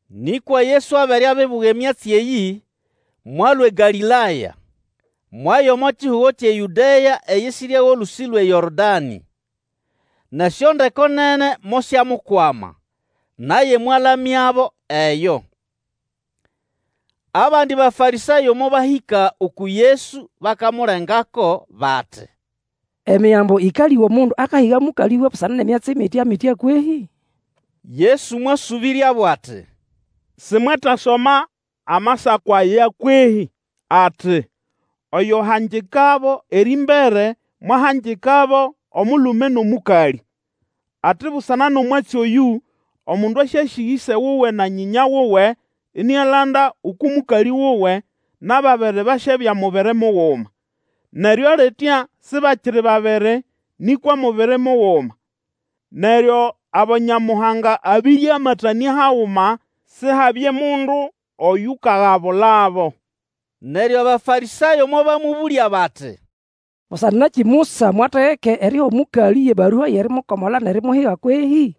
Nĩkwa Yesu abere abibuga emyatsi eyĩ, mwalũa eGalĩlaya, mwaya omo kihugo kyʼeYũdea eyisirya wʼolũsĩ lwʼeYorodanĩ. Nʼesyondeko nene mosyamukwama, naye mwalamyabo eyo. Abandi Bafarĩsayo mobahĩka uku Yesu bakamulengako bati, Emigambo ĩkalĩga omundu akahiga mũkalĩwe busana nʼemyatsi mitya-mitya kwehĩ? Yesu mwasũbĩryabo ati, Simwetasoma amasako aya kwehĩ? Ati, Oyo wahangikabo erĩmbere mwahangikabo, omulume nʼomũkalĩ, ati, Busana nʼomwatsi oyũ, omundu asyasĩga ĩse wuwe na nyĩnya wuwe, inialanda uku mũkalĩ wuwe, nʼababiri basyabya mubiri muguma. Neryo litya sibakiri babiri, nĩkwa mubiri muguma. Neryo abo Nyamuhanga abiriamatanĩa haguma, Sihabye mundu oyukagabulabo. Neryo Abafarĩsayo mobamũbũlya bati, Busana nakĩ Musa mwategeka eriha omũkalĩ yʼebarua yʼerimukomola nʼerimuhiga kwehĩ?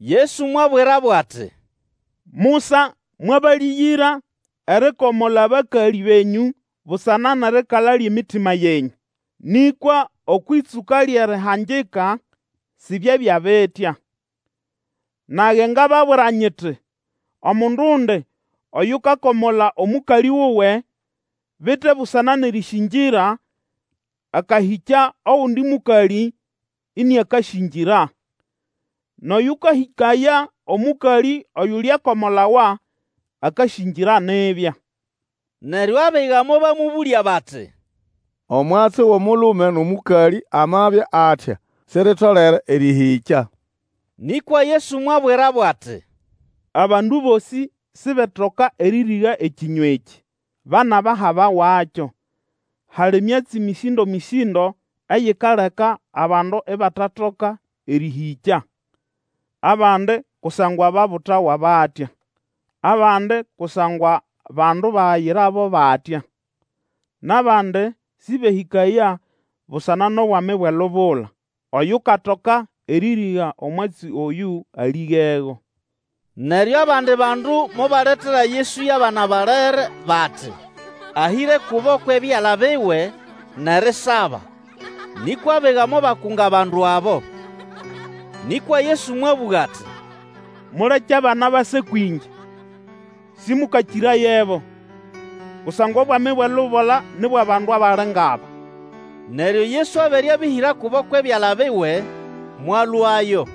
Yesu mwabwirabo ati, Musa mwabalĩgĩra erikomola abakalĩ benyũ busana nʼerikala lyʼemitima yenyũ; nĩkwa okwʼĩtsũka lyʼerihangika sibyabya bitya. Nage ngababwira nyiti, Omundundi oyukakomola omũkalĩ wuwe, bite busana nʼerĩsĩngĩra, akahĩkya ogundi mũkalĩ, iniakasĩngĩra, nʼoyũkahĩkaya omũkalĩ oyulyakomolawa akasĩngĩra nibya. Neryo abiga mobamũbũlya bati, Omwatsi wʼomulume nʼomũkalĩ amabya atya, siritolere erĩhĩkya. Nĩkwa Yesu mwabwirabo ati, Abandu bosĩ sibetoka erĩrĩga ekĩnywa ekĩ, ba nʼabahabawakyo. Hali myatsi mĩsĩndo-mĩsĩndo eyikaleka abandu ibatatoka erĩhĩkya. Abandi kusangwa babutawa batya; abandi kusangwa bandu bayirabo batya; nʼabandi sĩbehĩkaya busana nʼobwami bwʼelubula. Oyukatoka erĩrĩga omwatsi oyũ alĩgego. Neryo abandi bandu mobaletera Yesu yʼabana balere bati, ahĩre kubo kwʼebyala biwe, nʼerisaba, nĩkwa abiga mobakunga abandu abo. Nĩkwa Yesu mwabũga ati, Muleke abana base kwĩngye. Sĩmũkakĩrayebo, kusangwa Obwami bwʼelubula ni bwʼabandu abali ngʼaba. Neryo Yesu abere abĩhĩra kubo kwʼebyala biwe, mwalũayo.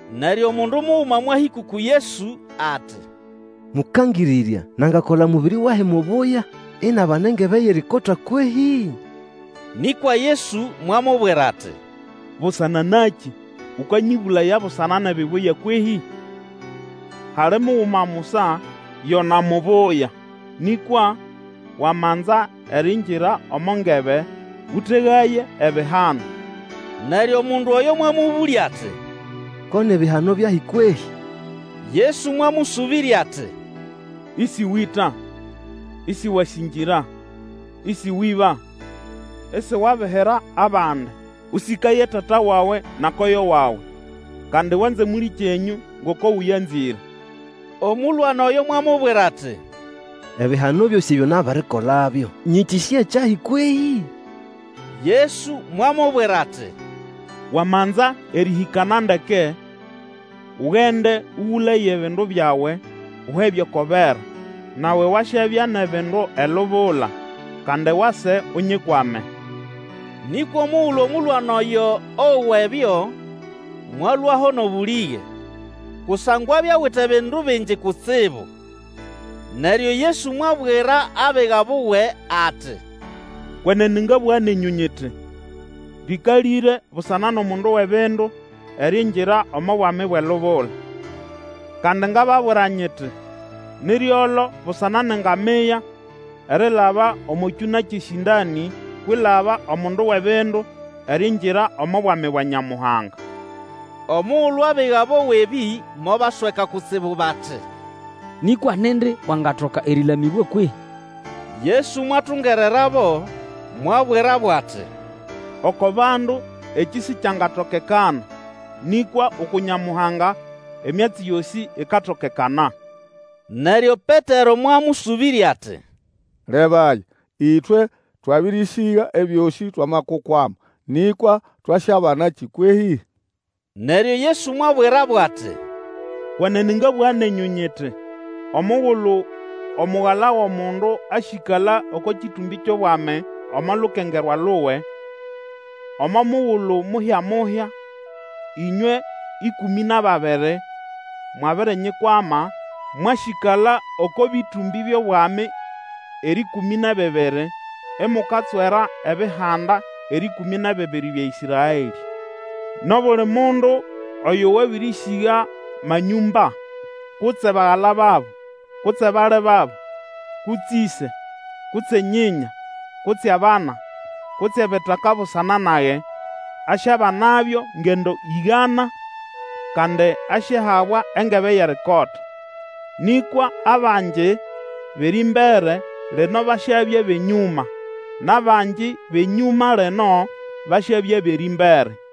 Neryo omundu muguma mwahĩka uku Yesu ati, Mũkangĩrĩrya, nangakola mũbĩrĩ wahi mubuya, inabana engebe yʼerikota kwehĩ? Nĩkwa Yesu mwamubwira ati, Busana nakĩ ukanyĩbũlaya busana nʼebibuya kwehĩ? Hali Muguma musa yona mubuya; nĩkwa wamanza eriingira omo ngebe, ũtegaye ebihano. Neryo mundu oyo mwamũbũlya ati, Ko ni bihano byahi kwehĩ? Yesu mwamũsũbĩrya ati, Ĩsĩwĩta, isiwasĩngĩra, Ĩsĩwĩba, isiwabihira abandi; Ũsĩkaye tata wawe na koyo wawe; kandi wanze mũlĩkyenyũ ngoko ũyanzĩre. Omũlwana oyo mwamubwira ati, Ebihano byosĩ ebyo nabirikolabyo, nyĩkĩsĩya kyahi kwehĩ? Yesu mwamubwira ati, Wamanza erĩhĩkana ndeke, ugende, ũgũlaye ebindu byawe, uhe byʼoko bera, nawe wasyabya nʼebindu elubula; kandi wase Unyikwame. Nĩkwa omugulu omũlwana oyo owa ebyo, mwalũaho nʼobũlĩge; kusangwa abya awite bindu bingi kutsibu. Neryo Yesu mwabwira abiga buwe ati, Kwenene ngabũga nenyũ nyiti, rĩkalĩre busana nʼomundu wʼebindu eriingira omo Bwami bwʼelubula. Kandi ngababwira nyiti, Ni ryolo busana nʼengamia erilaba omo kyũna kyʼesĩndanĩ kwilaba omundu wʼebindu eriingira omo Bwami bwa Nyamuhanga. Omugulu abiga bowa ebĩ mobasweka kutsibu bati, Nĩkwa nindi wangatoka erĩlamĩbwa kwehĩ? Yesu mwatungererabo, mwabwirabo ati, Oko bandu ekĩ sikyangatokekana, nĩkwa uku Nyamuhanga emyatsi yosĩ ikatokekana. Neryo Petero mwamũsũbĩrya ati, Lebaya, ĩtwe twabĩrĩsĩga ebyosĩ twamakukwama, nĩkwa twasyabanakĩ kwehĩ? Neryo Yesu mwabwirabo ati, Kwenene ngabũga nenyũ, nyiti, Omugulu Omugala wʼomundu asyĩkala oko kĩtũmbĩ kyʼobwami omo lukengerwa luwe, omo mugulu muhya-muhya, ĩnywe ĩkũmĩ nʼababiri mwabirinyikwama, mwasyĩkala oko bĩtũmbĩ byʼobwami erĩkũmĩ nʼebibiri, imukatswera ebihanda erĩkũmĩ nʼebibiri bya Ĩsraelĩ. Nʼobuli mundu oyo wabĩrĩsĩga manyũmba, kutse bagala babo, kutse bali babo, kutse ĩse, kutse nyĩnya, kutse abana, kutse ebitaka busana nage, asyabanabyo ngendo ĩgana, kandi asyahabwa engebe yʼerikota. Nĩkwa abangi bʼerĩmbere lino basyabya bʼenyũma, nʼabangi bʼenyũma lino, basyabya bʼerĩmbere.